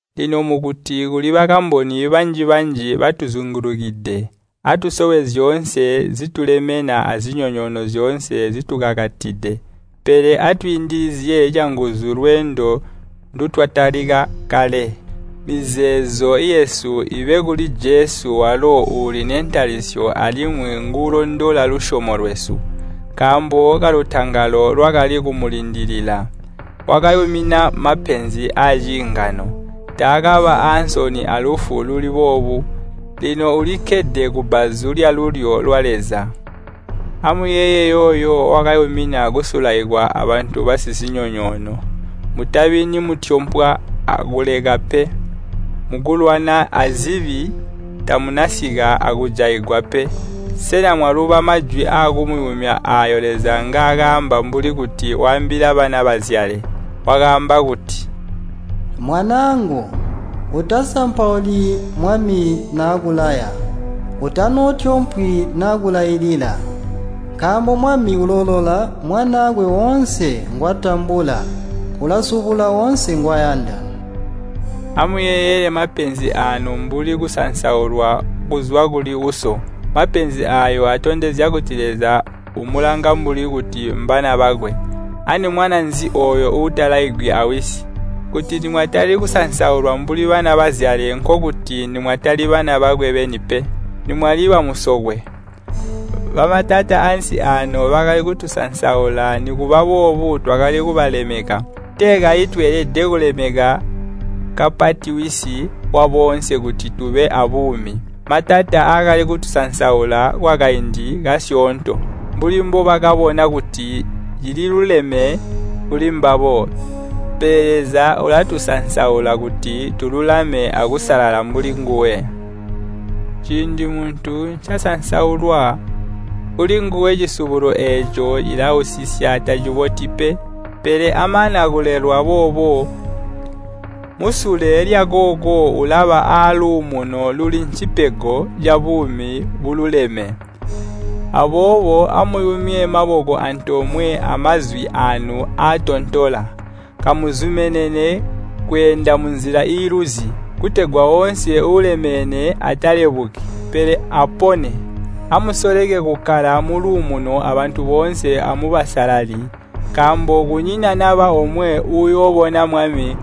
Lino mukuti kuli bakamboni banji-banji batuzingulukide, atusowe zyoonse zitulemena azinyonyoono zyoonse zitukakatide, pele atwiindilizye canguzu lweendo ndutwatalika kale. Mizeezo yesu iibe kuli Jesu walo uuli nentalisyo alimwi nguulondola lusyomo lwesu. Nkaambo kalutangalo lwakali kumulindilila, wakayumina mapenzi aciingano. Taakaba aansoni alufu luli boobu, lino ulikkede kubbazu lyalulyo lwa Leza. Amuyeeye yooyo, wakayumina kusulaikwa abantu basizinyonyoono! Mutabi nimutyompwa akuleka pe. Mukulwana azibi, tamunasika akujaigwa pe. Sena mwaluba majwi aakumuyumya aayo Leza ngaakaamba mbuli kuti waambila bana bazyale? Wakaamba kuti, “Mwanaangu, utasampauli Mwami nakulaya. Utanootyompwi nakulailila. Nkaambo Mwami uloolola mwanaakwe woonse ngwatambula, ulasubula woonse ngwayanda.” Amuyeeyele mapenzi aanu mbuli kusansaulwa kuzwa kuli uso. Mapenzi aayo atondenzya kuti Leza umulanga mbuli kuti mbana bakwe. Ani mwana nzi ooyo uutalaigwi awisi? Kuti nimwatali kusansaulwa mbuli bana bazyale nkokuti nimwatali bana bakwe beni pe, nimwali bamusokwe. Bamatata ansi ano bakali kutusansaula nikuba boobo twakali kubalemeka. Tee kayi tweelede kulemeka kapati Wisi waboonse kuti tube aabuumi? Matata akali kutusansaula, kwakaindi kasyoonto, mbuli mbobakabona kuti cililuleme kuli mbabo. Pele Leza ulatusansaula kuti tululame akusalala mbuli nguwe. Ciindi muntu ncasansaulwa, kulinguwe cisubulo eeco cilausisya taciboti pe. Pele amana kulelwa boobo, musule lyakooko ulaba aluumuno luli ncipego cabuumi bululeme. Aboobo amuyumye maboko antoomwe amazwi aanu aatontola. Kamuzumenene kweenda munzila iiluzi, kutegwa woonse uulemene atalebuki, pele apone. Amusoleke kukkala muluumuno abantu boonse amubusalali, nkaambo kunyina naba omwe uuyoobona Mwami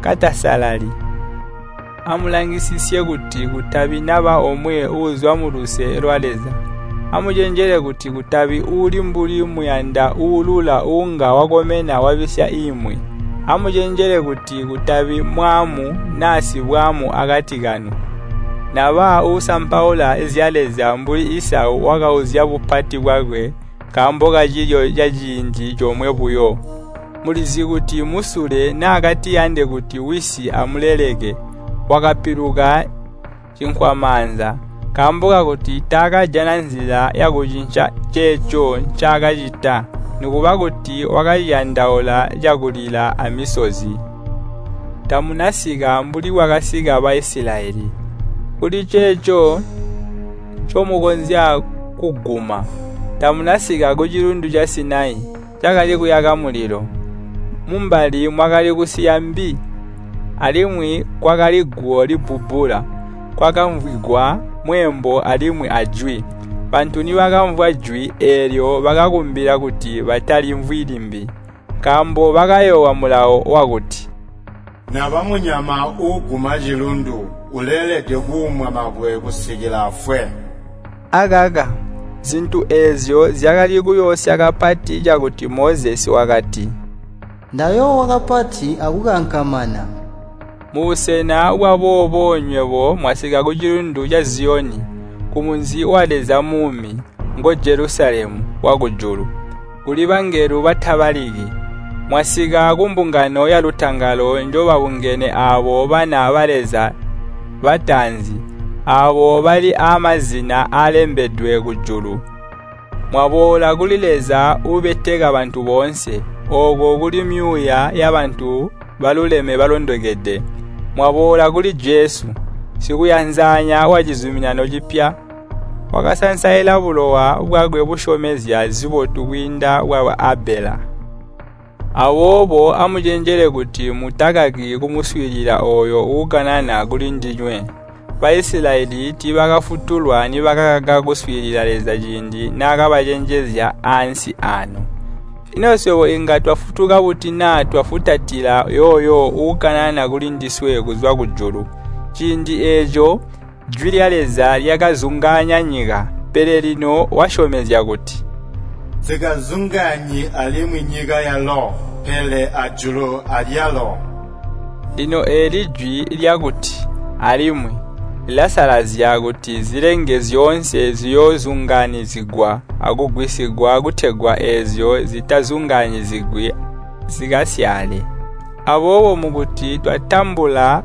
katasalali. Amulangisisye kuti kutabi naba omwe uuzwa muluse lwa Leza. Amucenjele kuti kutabi uuli mbuli muyanda uulula uunga wakomena wabisya imwi. Amucenjele kuti kutabi mwaamu naa sibwaamu akati kanu, naba uusampaula zya Leza mbuli Isau wakauzya bupati bwakwe nkaambo kacilyo caciindi comwe buyo. Mulizi kuti musule naakatiyande kuti wisi amuleleke, wakapiluka cinkwamaanza, nkaambo kakuti taakajana nzila yakucinca ceeco ncaakacita, nikuba kuti wakaciyandaula cakulila amisozi. Tamunasika mbuli bwakasika Baisilayeli, kuliceeco ncomukonzya kuguma. Tamuna sika kucilundu ca Sinai, cakali kuyaka mulilo. Mumbali mwakali kusiya mbi, alimwi kwakali guwo libbubbula. Kwakamvwigwa mweembo alimwi ajwi. Bantu nibakamvwa jwi eelyo bakakumbila kuti batalimvwi limbi. Nkaambo bakayoowa mulawo wakuti, “Naba munyama uuguma cilundu, uleelede kuumwa mabwe kusikila afwe.” Akaka, zintu eezyo zyakali kuyoosya kapati cakuti Mozesi wakati, “Ndayoowa kapati akukankamana!” Mubusena bwaboobo nywebo mwasika kucilundu ca Ziyoni, kumunzi wa Leza Muumi, ngo Jelusalemu wakujulu, kuli bangelo batabaliki. Mwasika kumbungano yalutangalo njobabungene aabo bana ba Leza bataanzi, aabo bali aamazina aalembedwe kujulu. Mwaboola kuli Leza uubeteka bantu boonse, ooko kuli myuuya yabantu baluleme balondokede. Mwaboola kuli Jesu, Sikuyanzanya wacizuminano cipya, wakasansaila bulowa bwakwe busyomezya zibotu kwiinda bwa Abela. Aboobo amucenjele kuti mutakaki kumuswiilila ooyo uukanana kulindinywe. Baisilayeli tiibakafutuka nibakakaka kuswiilila Leza ciindi naakabacenjezya ansi aano. Ino swebo inga twafutuka buti naa twafutatila yooyo uukanana kulindiswe kuzwa kujulu! Ciindi eeco jwi lya Leza lyakazungaanya nyika, pele lino wasyomezya kuti, “Nsikazungaanyi alimwi nyika yalo, pele ajulu alyalo.” Lino eeli jwi lyakuti, “Alimwi” lilasalazya kuti zilenge zyoonse ziyoozungaanyizigwa akugwisigwa kutegwa eezyo zitazungaanyizigwi zikasyaale. Aboobo mukuti twatambula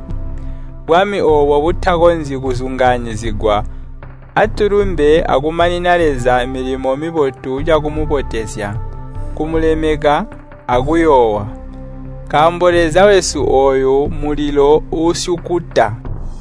bwami oobo butakonzyi kuzungaanyizigwa, atulumbe akumanina Leza milimo mibotu cakumubotezya, kumulemeka, akuyoowa. Nkaambo Leza wesu ooyu mmulilo uusyukuta.